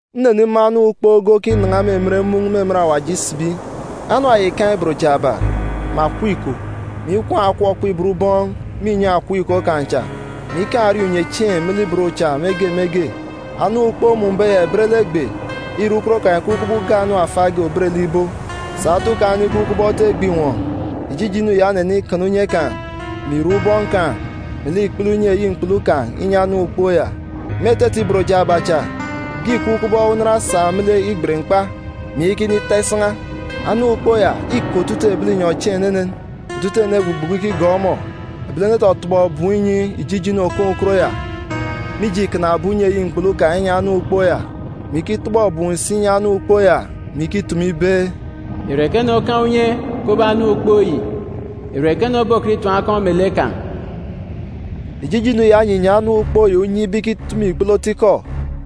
Nnenimun̄ anam ukpook ge okinan̄a me emen mun̄ me emen awaji isibi. Anam ya ìkaan̄ ibot jaaba, mè akọp iko, mè ikwuun̄ akọp okpibot ubọọn̄ me inyọn̄ akọp iko kan̄ cha, mè ikaan̄ erieen̄ unyechieen̄ me lek ibot cha me ge me ge. Anam ukpook mmun̄be ya ìbet lek egbe ntọọk ntọọk. Ire, ukot kan̄ ìkup kubọk ibo nriọk. Sà otu kan̄ onikup kubọk otu egbe àtat. Ijijinu ya onenikana unye kan̄, mè irek ubọọn̄ kan̄, melek ikpele unye eyi mkpulu kan̄, inyi anam ukpook ya. Me etete ibot jaaba cha, ge ìkup kubọk unan osak me lek igbet mkpa, mè iyaka inita isan̄a. Anam ukpook ya îke otutuuk ebi linyọn̄ chieen̄ enenen. Otutuuk ene egbugbuku ikigọọk ọmọ. Ebilene etọtọbọ ebum inyi ijijinu òkaan̄ ukot ya mije îkanabe unye eyi mkpulu kan̄ inyi anam ukpook ya, mè ikitọbọ ebum si inyi anam ukpook ya, mè ikitumu ibe, “Ìre ekene okaan̄ unye kubọk anam ukpook yi? Ìre ekene obokọt itim akọn̄ me lek kan̄?” Ijijinu ya onyinyi anam ukpook ya unye ibe ikitumu ikpele otu ikọ,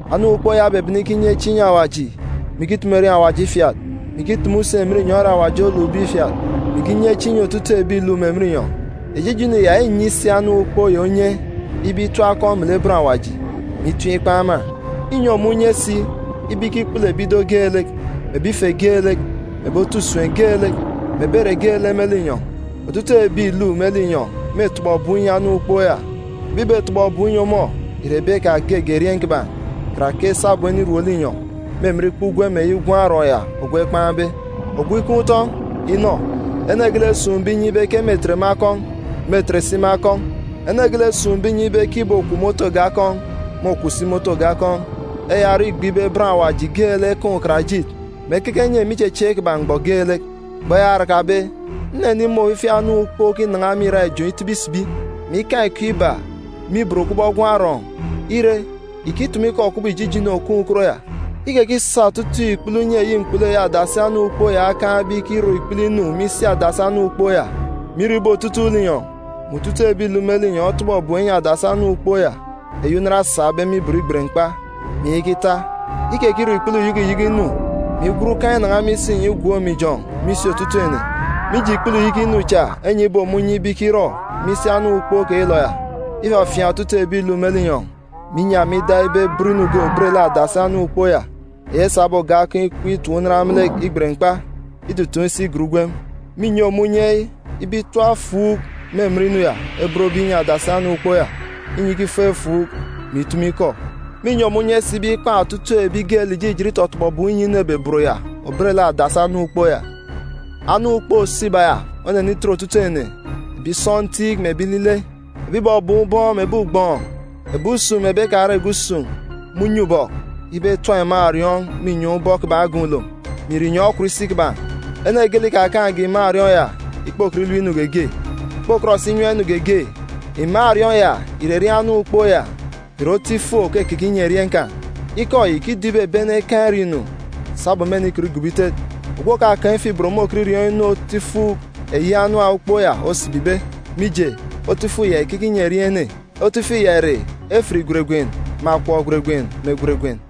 Anam ukpook ya obebene ikinye chieen̄ inyi Awaji, mè ikitumu erieen̄ Awaji ifiat, mè ikitumu si emen inyọn̄ ere Awaji olukbe ifiat, mè ikinye chieen̄ inyi otutuuk ebi ìluk me emen inyọn̄. Ijijinu ya înyi si anam ukpook ya unye ibe itim akọn̄ me lek bọn Awaji, mè itim ikpan̄ ema. Înyi ọmọ unye si ibe ikikpulu ebi ido geelek, mè ebi ife geelek, mè ebi otu usem geelek, mè ebi ere geelek me linyọn̄. Otutuuk ebi ìluk me linyọn̄ mêtọbọ ebum inyi anam ukpook ya. Ebi ìbetọbọ ebum inyi ọmọ ìre ebi kpege erieen̄ kiban̄, karake sabum enirom linyọn̄, me emen ikpa ugwem eyi Gwun̄ Arọọn̄ ya ogwu ekpan̄be. Ogwu ikaan̄ utọn̄, inọ! Ene geelek esun̄be inyi ibe ke mêtet me akọn̄, mêtet si me akọn̄. Ene geelek esun̄be inyi ibe ke ìbokwu me otu oge akọn̄, môkwu si me otu oge akọn̄. Eya orọ, îkup me uyọt ibe bọn Awaji geelek ekaan̄ ukarajit, mè ekeke enye me ichechieek kiban̄ mgbọ geelek. Mgbọ eya orakabe, nnenimun̄ ofifi anam ukpook okinan̄a me irak ijọn̄ itibi isibi, mè ikaan̄ iko iba me ibot kubọk gwun̄ arọọn̄. Ire, ìkitumu ikọ kubọk ijijinu òkaan̄ ukot ya. Ikekisa otutuuk ikpele unye eyi mkpulu eyi adasi anam ukpook ya okaan̄be ikirọ ikpele inu me isi adasi anam ukpook ya, mè irọ ibe otutuuk linyọn̄, mè otutuuk ebi ìluk me linyọn̄ etọbọ ebum enyi adasi anam ukpook ya, eyi unan osakbe me ibot igbet mkpa, mè iyaka ita. Ikekirọ ikpele uyeke uyeke inu, mè igwen ukan̄ inan̄a me isinyọn̄ igwook me ijọn̄ me isi otutuuk ene. Mije ikpele uyeke inu cha enyibe ọmọ unye ibe ikirọ me isi anam ukpook keyilọ ya, ifafiaan̄ otutuuk ebi ìluk me linyọn̄, mè inyi ema ida ibe ebot inu ge òbet lek adasi anam ukpook ya, eyi esabe oge akọn̄ ikep itap unan me lek igbet mkpa, itutuun̄ isi igat ugwem. Mînyi ọmọ unye ibe itap efuuk me emen inu ya ebotbe inyi adasi anam ukpook ya, inyi ikifuuk efuuk, mè itumu ikọ. Mînyi ọmọ unye si ibe ikpan̄ otutuuk ebi geelek ìjijit itọtọbọ ebum inyi inu ebobot ya òbet lek adasi anam ukpook ya. Anam ukpook òso iba ya onenitet otutuuk ene, ebi sọntiik mè ebi ilile, ebi ìbọbọọn̄ ubọọn̄ mè ebi ugbọọn̄, ebi usun̄ mè ebi ekarege usun̄, me unye ubọk, ibe etap iman̄ òriọọn̄ me inyọn̄ ubọk kiban̄ agan̄ ulom, mè ìre inyọn̄ okwut isi kiban̄. Ene geelek ikakaan̄ge iman̄ òriọọn̄ ya ìkpokọt ilep inu geege, ìkpokọt si inyam inu geege. Iman̄ òriọọn̄ ya ìre erieen̄ anam ukpook ya, mè ìre otu ifuk òkekeke inyi erieen̄ kan̄. Ikọ yi ìkido ibe ebi ene ekaan̄ iriọọn̄-inu sabum mênikọt igobo itet. Ogwu òkakaan̄ ifuk-ibot môkọt iriọọn̄ inu otu ifuk eyi anam ukpook ya osibibe, mije, otu ifuk ya ìkeke inyi erieen̄ ene. Otu ifuk ya ìre efit gweregwen, mè akọp gweregwen, mè gweregwen.